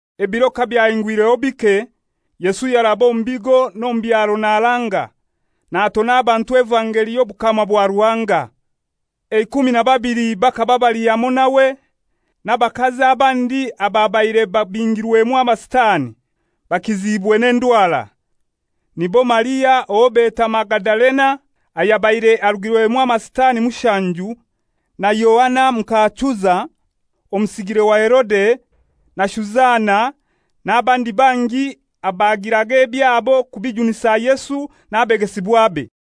Ebiro kabyahingwireho bike, Yesu yaraba omu bigo n'omu byaro naranga, natona abantu evangeli y'obukama bwa Ruhanga. Eikumi na babili bakaba bali hamoi nawe, n'abakazi abandi ababaire babingirwemu amasitani, bakiziibwe n'endwara. Nibo Maria owo beta Magadalena, abayabire arugirwemu amasitani mushanju, na Yoana muka Chuza, omusigire wa Herode, na Shuzana, n'abandi bangi abagiraga ebyabo kubijunisa Yesu n'abegesibwabe.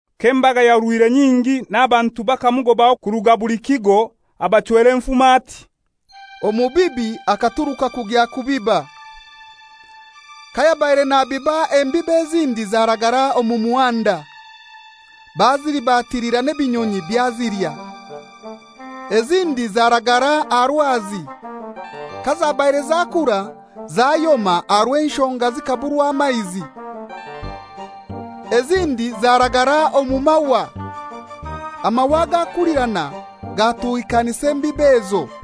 K'embaga yahurwire nyingi, n'abantu bakamugobaho kuruga buli kigo, abachwera enfumo ati, «Omubibi akaturuka kugya kubiba. Kayabaire nabiba embibo ezindi zaragara omu muhanda, bazilibatilira n'ebinyonyi byazilya. Ezindi zaragara aha rwazi; kazabaire zakura, zayoma aha rw'enshonga zikaburwa amaizi. Ezindi zaragara omu mahwa; amahwa gakulirana gatuhikanisa embibo ezo.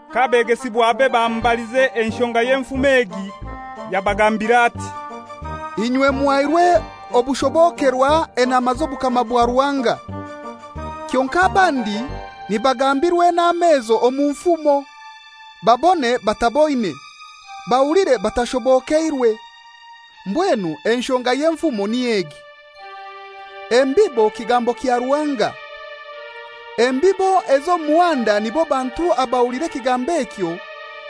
K'abegesibwabe bamubalize enshonga y'enfumo egi, yabagambira ati, «Inywe muhairwe okushobokerwa enama z'obukama bwa Ruhanga. Kyonkai abandi nibagambirwa enama ezo omu nfumo, babone bataboine, bahuliire batashobokeirwe. «Mbwenu enshonga y'enfumo niy'egi: Embibo kigambo kya Ruhanga. Embibo ez'omu muhanda nibo bantu abahulira ekigambo ekyo,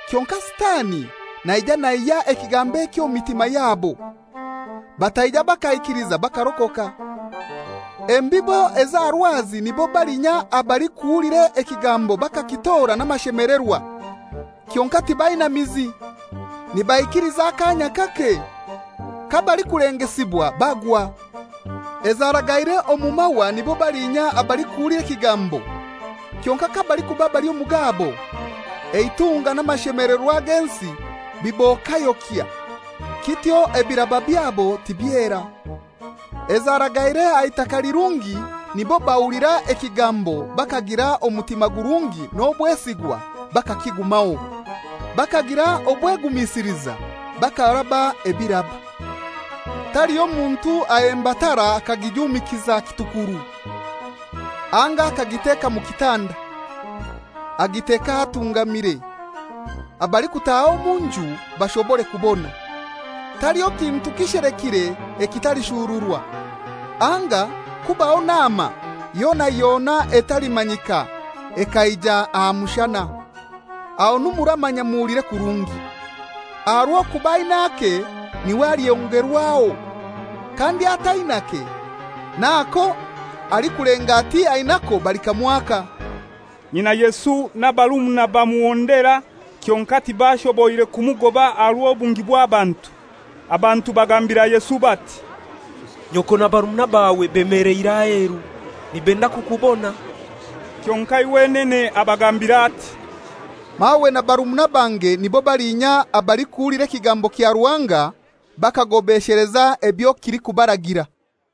kyonkai Sitani naija naihya ekigambo ekyo omu mitima yabo, bataija bakaikiliza bakarokoka. Embibo ez'aha rwazi, nibo balinya abalikuhulira ekigambo bakakitora n'amashemelerwa, kyonkai tibaina mizi: nibaikiliza akanya kake, kabalikulengesibwa bagwa. Ezaragaire omu mahwa nibo balinya abalikuhulira ekigambo, kyonkai kabalikuba bali omu gabo, eitunga n'amashemelerwa g'ensi bibokayokya, kityo ebiraba byabo tibyera. Ezaragaire aha itaka lirungi nibo bahulira ekigambo bakagira omutima gurungi n'obwesigwa bakakigumaho, bakagira obwegumisiliza bakaraba ebiraba. «Taliho muntu ahemba tara akagijumikiza kitukuru, anga akagiteka mu kitanda. Agiteka ahatungamire, abalikutaaha omu nju bashobore kubona. Taliho kintu kishelekire ekitalishururwa, anga kubaho nama yona yona etalimanyika ekaija aha mushana. Ahonu muramanya muhulire kurungi; aha rw'okuba ain'ake n'iwe alyongerwaho, kandi atainake, n'ako alikulenga ati ainako balikamwaka.» Nyina Yesu n'abarumuna bamuhondera, kyonkai tibashoboire kumugoba aha rw'obungi bw'abantu. Abantu bagambira Yesu bati, «Nyoko na barumuna bawe bemeleire aheru, nibenda kukubona.» Kyonkai wenene abagambira ati, «Mawe na barumuna bange nibo balinya abalikuhulira ekigambo kya Ruhanga bakagobesheleza ebyo kilikubaragira.»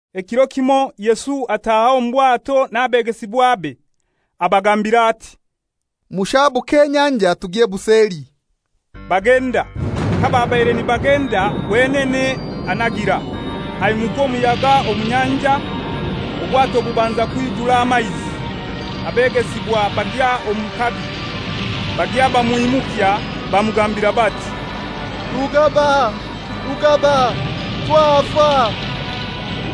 Ekiro kimoi Yesu ataaha omu bwato n'abegesibwabe. Abagambira ati, «Mushabuke enyanja tugye buseli.» Bagenda; kababaire nibagenda, wenene anagira. Hamukwa omuyaga omu nyanja, obwato bubanza kwijura amaizi, abegesibwa bagya omu kabi. Bagya bamwimukya, bamugambira bati, «Rugaba! Rugaba! Twafa!»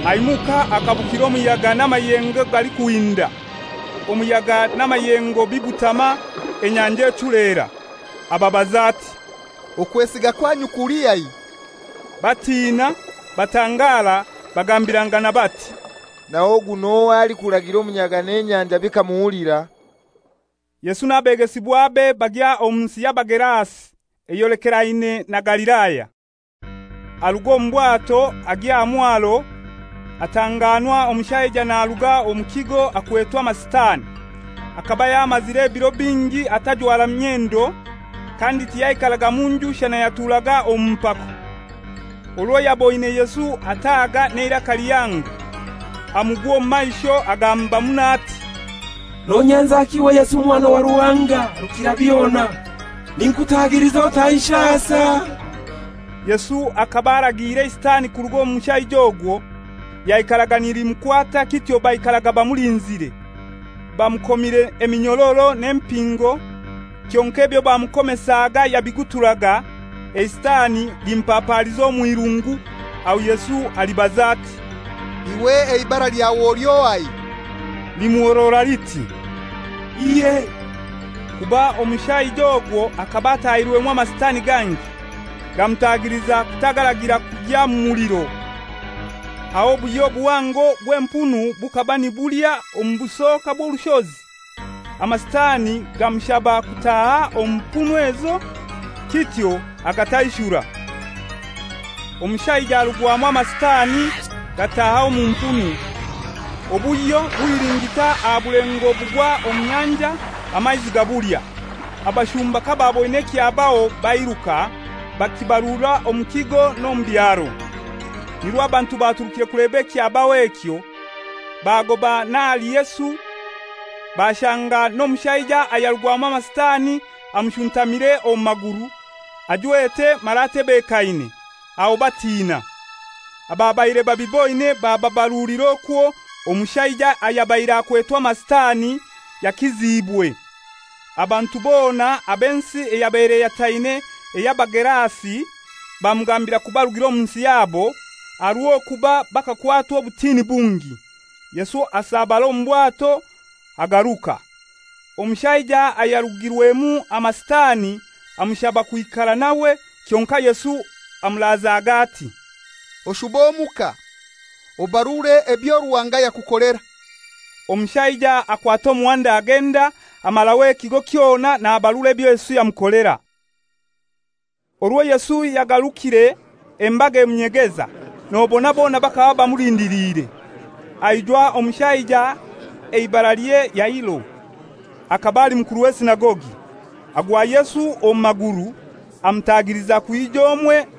Aimuka akabukira omuyaga n'amayengo galikuhinda; omuyaga n'amayengo bibutama, enyanja echulera. Ababaza ati, «Okwesiga kwanyu kulihai?» Batina, batangara, bagambirangana bati, «Naho ogu n'ohai alikuragira omuyaga n'enyanja bikamuhulira?» Yesu n'abegesibwabe bagya omu nsi y'Abagerasi, eyolekeraine na Galilaya. Aruga omu bwato agya aha mwaro, atanganwa omushaija naruga omu kigo akwetwe amasitani. Akaba yamazire ebiro bingi atajwara myendo, kandi tiyaikaraga mu nju shana yaturaga omu mpako. Orwo yaboine Yesu ataaga n'eiraka lihango, amugwa omu maisho, agamba muno ati, «Nonyenzaki iwe Yesu Omwana wa Ruhanga Rukirabyona? Ninkutagiliza otanshasa.» Yesu akaba aragiire eisitani kuruga omu mushaija ogwo. (Lyaikaraga nilimukwata; kityo baikaraga bamulinzire, bamukomire eminyororo n'empingo, kyonkai ebyo bamukomesaga yabiguturaga, eisitani limupapaaliza omw'irungu.) Aho Yesu alibaza ati, «Iwe eibara lyawe oli ohai?» Limuhorora liti, «Ihe;» kuba omushaija ogwo akaba atahirwemu amasitani gangi. Gamutagiliza kutaagaragira kugya mu muliro. Aho obuhyo buhango bw'empunu bukaba nibulya omu busoka bw'orushozi; amasitani gamushaba kutaaha omu mpunu ezo. Kityo agataishura. Omushaija arugwamu amasitani, gataaha omu mpunu, obuhyo buhilingita aha bulengo bugwa omu nyanja, amaizi gabulya. Abashumba kabaaboine ekyabaho, bairuka, bakibarura omu kigo n'omu byaro. Nirwo abantu baturukire kuleba ekyabaho ekyo, bagoba n'ahali Yesu, bashanga n'omushaija ayarugwamu amasitani amushuntamire omu maguru, ajwete mara atebekaine. Aho batiina. Ababaire babiboine bababarulira okwo omushaija ayabaire akwetwe amasitani yakiziibwe. Abantu bona ab'ensi eyabaire eyataine ey'Abagerasi bamugambira kubarugira omu nsi yabo, aha rw'okuba bakakwatwa obutini bungi. Yesu asabara omu bwato, agaruka. Omushaija ayarugirwemu amasitani amushaba kwikara nawe, kyonkai Yesu amurazage, ati, «Oshube omuka, obarure ebyo Ruhanga yakukolera.» Omushaija akwata omuhanda agenda, amaraho ekigo kyona nabarura ebyo Yesu yamukolera. Orwo Yesu yagarukire, embaga emunyegeza, nobona bona bakaba bamulindiliire. Aijwa omushaija eibaralye Yairo, akaba ali mukuru w'esinagogi. Agwa Yesu omu maguru, amutagiliza kwija omwe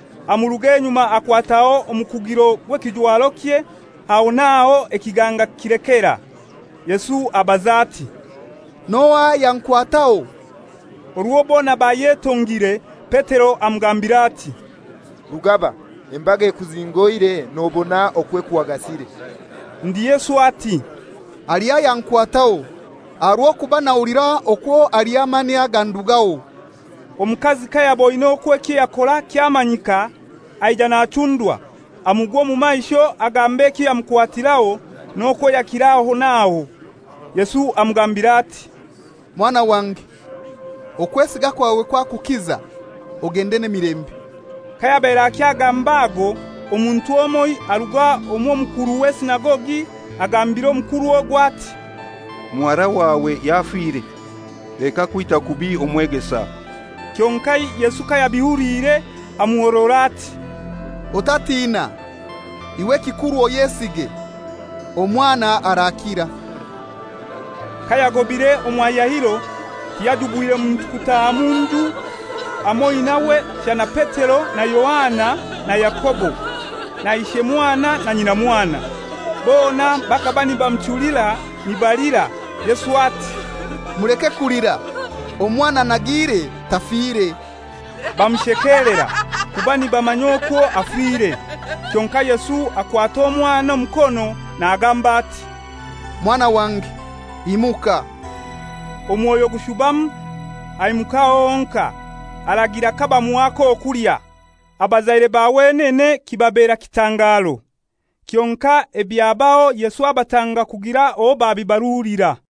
amuruga enyuma akwataho omukugiro gw'ekijwarokye; aho n'aho ekiganga kilekera. Yesu abaza ati, «N'ohai ayankwataho?» Orwo bona bayetongire, Petero amugambira ati, «Rugaba, embaga ekuzingoire, nobona okwo ekuhagasire!» Ndi Yesu ati, «Haliho ayankwataho, aha rw'okuba nahulira okwo aliho amani agandugaho.» Omukazi kayaboine okwo ekyo yakora kyamanyika, aija nachundwa, amugwa omu maisho agamba ekyo yamukwatiraho, n'okwo yakira aho n'aho. Yesu amugambira ati, «Mwana wange, okwesiga kwawe kwakukiza, ogende n'emilembe.» Kayabaire akyagamba ago, omuntu omoi aruga omw'omukuru w'esinagogi agambira omukuru ogwo ati, «Muhara wawe yafire. Leka kwita kubi omwegesa.» Kyonkai Yesu kayabihuliire amuhorora ati, «Otatiina; iwe ekikuru oyesige, omwana arakira.» Kayagobire omwa Yairo, tiyajubwire muntu kutaaha mu nju hamoi nawe, shana Petero na Yohana na Yakobo, na ishemwana na nyinamwana. Bona bakaba nibamuchulira, nibalira. Yesu ati, «Muleke kulira; omwana anagiire, tafire.» Bamushekelera, kuba nibamanya okwo afire. Kyonkai Yesu akwata omwana omukono nagamba ati, «Mwana wange, imuka.» Omwoyo gushubamu, aimuka aho honkai. Aragira kabamuha ak'okulya. Abazaire ba wenene kibabera kitangaro; kyonkai ebyabaho Yesu abatanga kugira owo babibarulira.